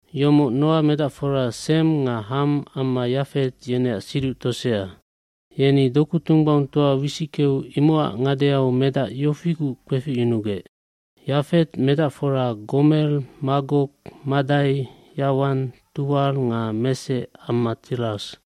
Yomoc Noa medacfora Sem nga Ham amma Yafet yeneac siduc tosea. Yeni doku tunggbaungtoa wisickeu imocac ngadeau medac yofiguc kpeficyunugec. aYafet medacfora Gomer, Magog, Madai, Yawan, Tuwal nga Mesec amma Tiras.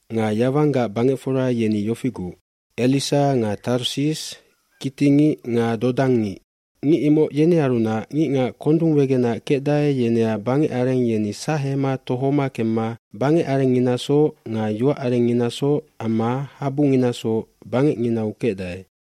Nga Yawanggac bangecfora yeni yofiguc, Elisa nga Tarsis, kittingic nga dodangngic. Ngic imoc yenearunac ngicngac kondung wegenac kecdae yeneac bangecareng yeni sahema tohoma kemma bangecarengnginasoc nga yoacarengnginasoc amma habunginasoc bangecnginau kecdae.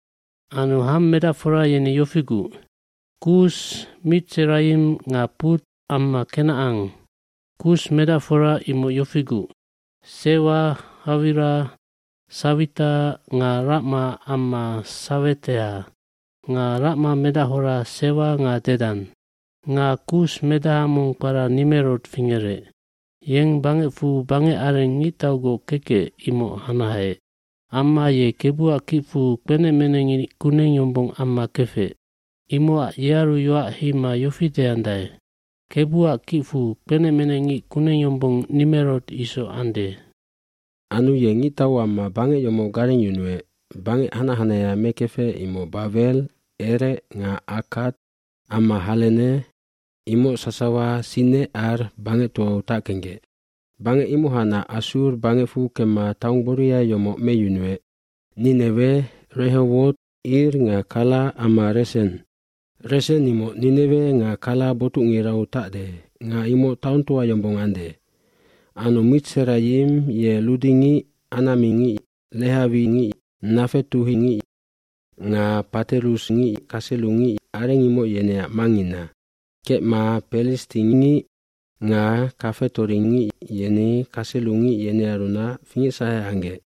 Anu Ham medacfora yeni yofiguc, Kus, Mitserayim nga Put amma Kenacan. Kus medacfora imoc yofiguc, Sewa, Hawila, Sawita nga Racma amma Saweteha. Nga Racma medachora Sewa nga Dedan. Nga Kus medaha mong kpara Nimerod fingerec. Yeng bangecfu bangec areng ngictaugoc kekec imoc hanaheec. Amma ye Kebuac kicfu kpenecmenecngic kuneng yombong amma kefec. Imocac yearu yoac heima yofi deandae, “Kebuac kicfu kpenecmenecngic kuneng yombong Nimerod isoc ande.” Anu ye ngictau amma bangec yomoc garengyunuec, bangec hanac hanahea mekefec imoc Bawel, Erec nga Akkad amma Halene, imoc sasawa Sinecar bangectoau tackenggec. Bangec imohacnac Assur bangecfu kemma taong gboria yomoc meyunuec, Ninewe, Rehowot Ir nga Kala amma Resen. Resen imoc Ninewe nga Kala botucngirau tacde nga imoc taongtoa yombong ande. Anu Mitserayim ye ludingic, anamingic, lehawingic, nga paterusngic amma kaselungic, areng imoc yeneac mangngina. Kecma pelistingic nga kafetoringic yeni kaselungic yenearunac fingecsahe anggec.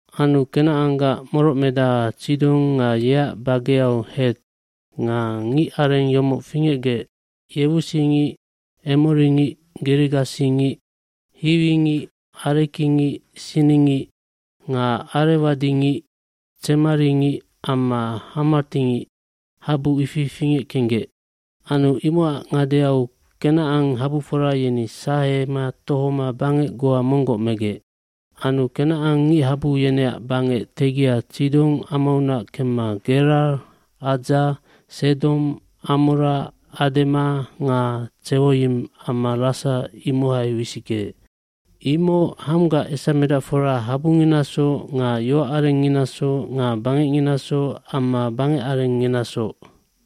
Anu Kenacanggac morocmedaha Tsidon nga yeac bageau Het nga ngicareng yomoc fingecgec yewusingic, emoringic, girigasingic, hiwingic, arekingic, siningic, nga arewadingic, tsemaringic amma hamatingic, habu ifi fingeckenggec. Anu imocac ngadeau Kenacan habufora yeni sahema tohoma bangec goa monggoc megec. Anu Kenacan ngichabu yeneac bangec tegia Tsidon amaunac kemma Gerar, Adza,b Sedom, Amora,c Adema nga Tsewoyim amma Lasa imohai wisickeec. Imoc Hamgac esamedacfora habunginasoc nga yoacarengnginasoc nga bangecnginasoc amma bangecarengnginasoc.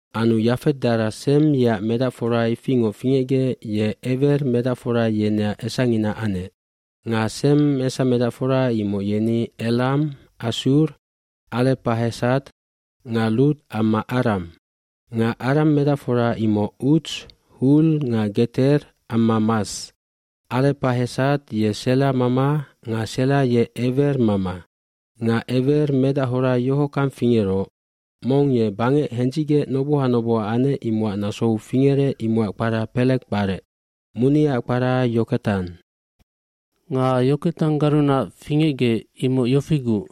Anu Yafet dara Sem yeac medacfora ifingoc fingecgec ye Ewer medacfora yeneac esangina anec. Nga Sem esamedacfora imoc yeni Elam, Assur, Arepahesad nga Lud amma Aram. Nga Aram medacfora imoc Uts, Hul nga Geter amma Mas. dArepahesad ye Sela mama nga Sela ye Ewer mama. Nga Ewer medachora yohockang fingeroc, mong ye bangec hendzicgec noboha noboha anec imocac nasou fingerec imocac kpara Pelege kparec. Muniaac kpara Yoketan. Nga Yoketanggarunac fingecgec imoc yofiguc,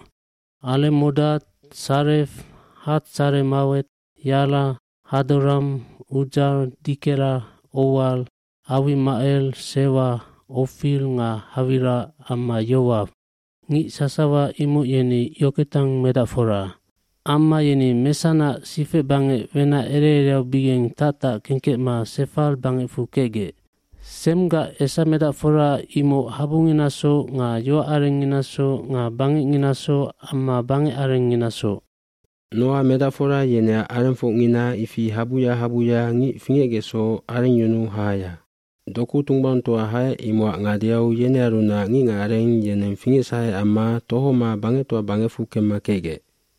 Alemodad, Salef, Hatsaremawet, Yara, Hadoram, Udzal, Dikela, Owal, Awimacel, Sewa, Ofir nga Hawila amma Yowaw. Ngic sasawa imoc yeni Yoketan medacfora. Amma yeni Mesanac sifecbangec wenac ere ereaubigeng tactackengkecma Sefar bangecfu kecgec. Semgac esamedacfora imoc habunginasoc nga yoacarengnginasoc nga bangecnginasoc amma bangecarenginasoc. fNoa medacfora yeneac arengfocngina ifi, habuya habuya ngic fingecgecsoc arengyunu hahaya. Doku tunggbaungtoa haec imocac ngadeau yenearunac ngicngacareng yeneng fingecsahe amma tohoma bangectoa bangecfu kemma kecgec.